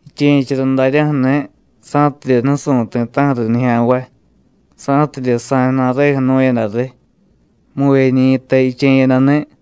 Jiche̱chara daryaju̱ni̱, sa̱tidye nusu̱y ti̱ta̱ju̱ riy nijya̱nvay, sa̱tidye sa̱y ju̱na̱reju̱ jnu̱yada riy, muvyeñi̱ta jiche̱yadani̱.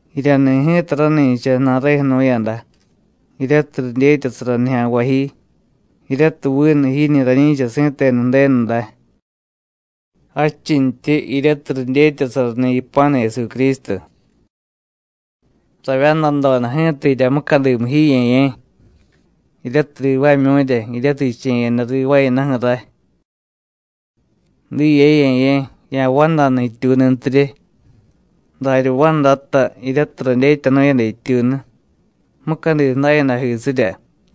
Jiryani̱ ji̱ta rani̱cha ju̱na̱reju̱ jnu̱yada, jiryatiy ridyetyasara nijya̱nvay ji, jiryatiy vinu jiñi̱ rañi̱cha si̱tenu Ju̱denu day, jadchintyi, jiryatiy ridyetyasarani̱ yipa̱nu Jesucrístu. Ravyandadoda ji̱ta jirya mucadimu ji, Ye̱ye̱, jiryatiy rivaamyu̱rya jiryatiy jiche̱yada rivaayadaju̱ ray. Diye, Ye̱ye̱, ya̱vandanu jityuununtirye, darya vandata jiryatiy radyetyanu̱yada jityuunu, mucadi ju̱dayadajisirya.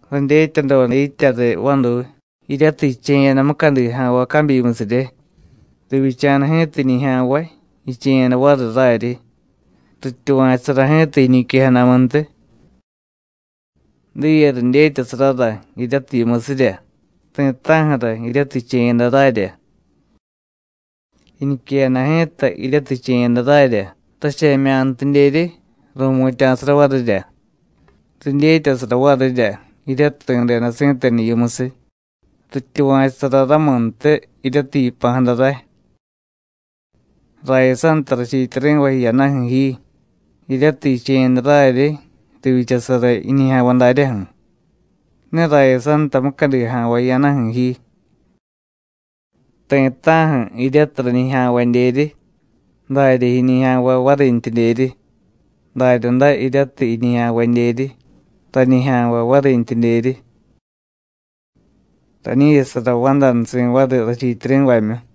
Radyetyadoda yitya riy vaduy, jiryatiy jiche̱yada mucadi ja̱nvay cabyimusirye. Rivyicha̱da ji̱ta jiñijya̱nvay, jiche̱yada variy raryi. Rityuva̱chusara ji̱ta jiñiquejadamuntiy. Diye ridyetyasarara jiryatiy yimusirya ti̱ta̱ju̱ra jiryatiy jiche̱yada rarya. Jiñiquejada ji̱ta, jiryatiy jiche̱yada rarya, rache̱mya̱ntidyeryi, ru̱mutya̱sara varirya. Ridyetyasara varirya, jiryatiy ri̱deda si̱tenu yimusiy, rityuva̱chusara ramuntiy, jiryatiy yipa̱jada ray. Rayasanta rachiityari̱vay jiyadaju̱ ji, jiryatiy jiche̱yada raryi, rivyichasara jiñijya̱nvay daryaju̱. Ne rayasanta mucadi ja̱nvay jiyadaju̱ ji. Ti̱ta̱ju̱ jiryatiy rañijya̱nvadyeryi, darya jiñijya̱nvay varintyidyeryi, daryaday jiryatiy jiñijya̱nvadyeryi, rañijya̱nvay varintyidyeryi. Rañi̱chasara vandanusi̱ variy rachiityari̱vamyu.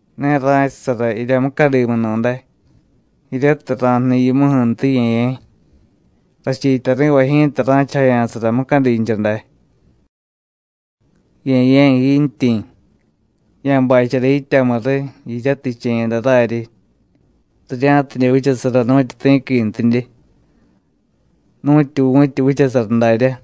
Ne ra̱chasara jirya mucadimunu̱day, jiryatiy ra̱jniy yimuju̱ntiy, Ye̱ye̱. Rachiityari̱vay ji̱ta ra̱chajaya̱sara mucadincha day. Ye̱ye̱ jiintyi̱, ya̱bachara yityamu riy jiryatiy jiche̱yada raryi, rirya̱tidye vichasara nu̱tyu ti̱quintidye, nu̱tyu vu̱tyi vichasara daryá.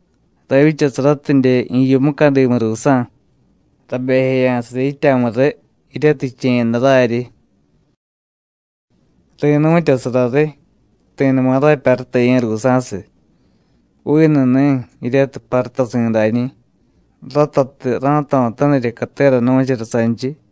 Ravyichasaratidye jiyu mucadimu ruusa̱, rabejeya̱sara yityamu riy, jiryatiy jiche̱yada raryi. Ri̱nu̱tyasara riy, ti̱numa rapyarutaye̱ ruusa̱siy, vinu ni̱ jiryatiy parutasi̱dañi̱, ratatiy ra̱jto̱tanirya catera nu̱chara sanchiy.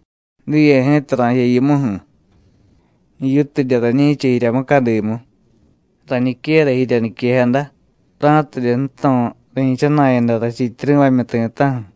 Diye ji̱ta ra̱jiya yimuju̱. Jiyutidye rañi̱cha jirya mucadimu, rañiquera jirya niquejada, ra̱tidye ju̱to̱ ri̱chana̱yada rachiityari̱vamyu ti̱ta̱ju̱.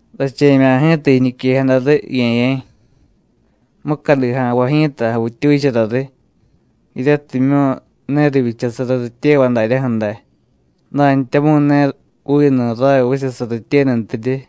Rache̱mya̱ ji̱ta jiñiquejada riy, Ye̱ye̱. Mucadi ja̱nvay ji̱ta javittyuchara riy, jiryatimyu̱ ne rivyichasara rityevay daryaju̱ day, dantyamu̱y ne vinu ray vichasara rityenuntidye.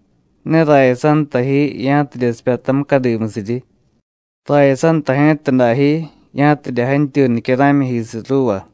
Ne rayasanta ji, ya̱tidye sipyata mucadimusiryi. Rayasanta ji̱ta dajyi, ya̱tidye jantyuy nicyara̱myijisiy ruuva.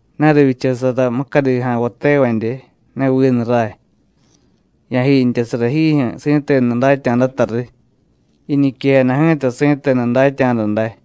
Ne rivyichasara mucadi ja̱nvay tevadye, ne vinu ray. Ya̱jiintyasara jiijyu̱ si̱tenu datya̱data riy. Jiñiquejada ji̱ta si̱tenu datya̱da day.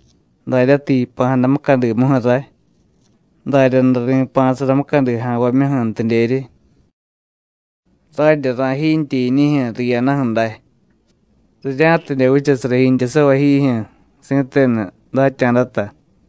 Daryatiy yipa̱jada mucadimuju̱ ray, daryaday ri̱pa̱sara mucadi ja̱nvamyuju̱ntidyeryi. Radye rajiintye jiñijyu̱ riyadaju̱ day, rirya̱tidye vichasara jiintyasavay jiijyu̱ si̱tenu datya̱data.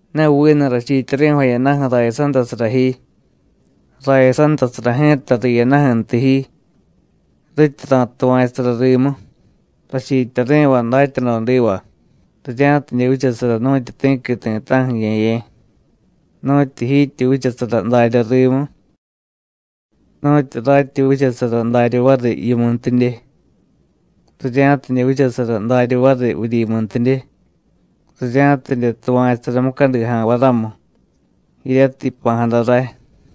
Ne vinu rachiityari̱vay jiyadaju̱ rayasantasara ji, rayasantasara ji̱ta riyadaju̱ntiy ji, rityi ra̱tuva̱chusara rimu, rachiityari̱vay datyadodiva, rirya̱tidye vichasara nu̱tyu ti̱qui ti̱ta̱ju̱, Ye̱ye̱, nu̱tyu jiityi vichasara darya rimu, nu̱tyu ratyi vichasara darya variy yimuntidye, rirya̱tidye vichasara darya variy vuryimuntidye, rirya̱tidye tuva̱chusara mucadi ja̱nvay ramu, jiryatiy yipa̱jada ray.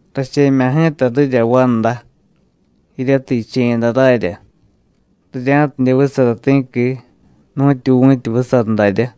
Rache̱mya̱ ji̱ta rirya vanda, jiryatiy jiche̱yada rarya, rirya̱tidye vichasara ti̱qui, nu̱tyu vu̱tyi vichasara daryá.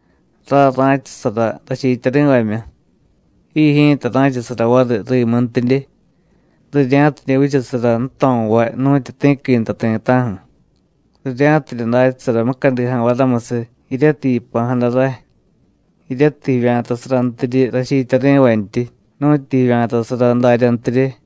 Ray ra̱chasara rachiityari̱vamyu, ji ji̱ta ra̱chasara variy rimuntidye, rirya̱tidye vichasara ju̱to̱vay nu̱tyu ti̱qui nta ti̱ta̱ju̱, rirya̱tidye datyasara mucadi ja̱nvay ramusiy jiryatiy yipa̱jada ray, jiryatiy jivya̱tasarantiryi rachiityari̱vantyi, nu̱tyu jivya̱tasara daryantirye.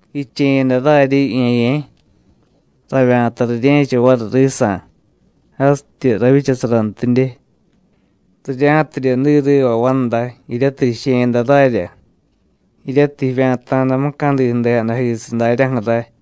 Jiche̱yada raryi, Ye̱ye̱, ravya̱ta rirye̱cha variy risa̱, jasityi ravyichasarantidye, rirya̱tidye diy riva vanda, jiryatiy jiche̱yada rarya, jiryatiy jivya̱ta̱da mucadi ju̱dejadajisiy daryaju̱ ray.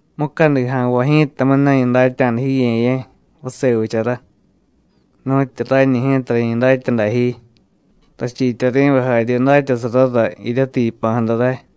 Mucadi ja̱nvay ji̱tamu̱y ne rañi datya̱da ji, Ye̱ye̱ vase vichara, nu̱tyu rañi ji̱ta rañi datya̱da ji, rachiityari̱vay jarye datyasarara jiryatiy yipa̱jada ray.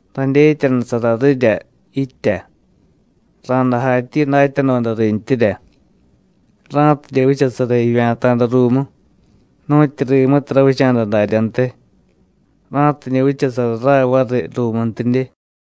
Radyetyanusara rirya yitya, ra̱day jatyi datyadoda rintyirya, ra̱tidye vichasara jivya̱ta̱da ruumu, nu̱tyu rimutiy ravicha̱da daryantiy, ra̱tidye vichasara ray variy ruumuntidye.”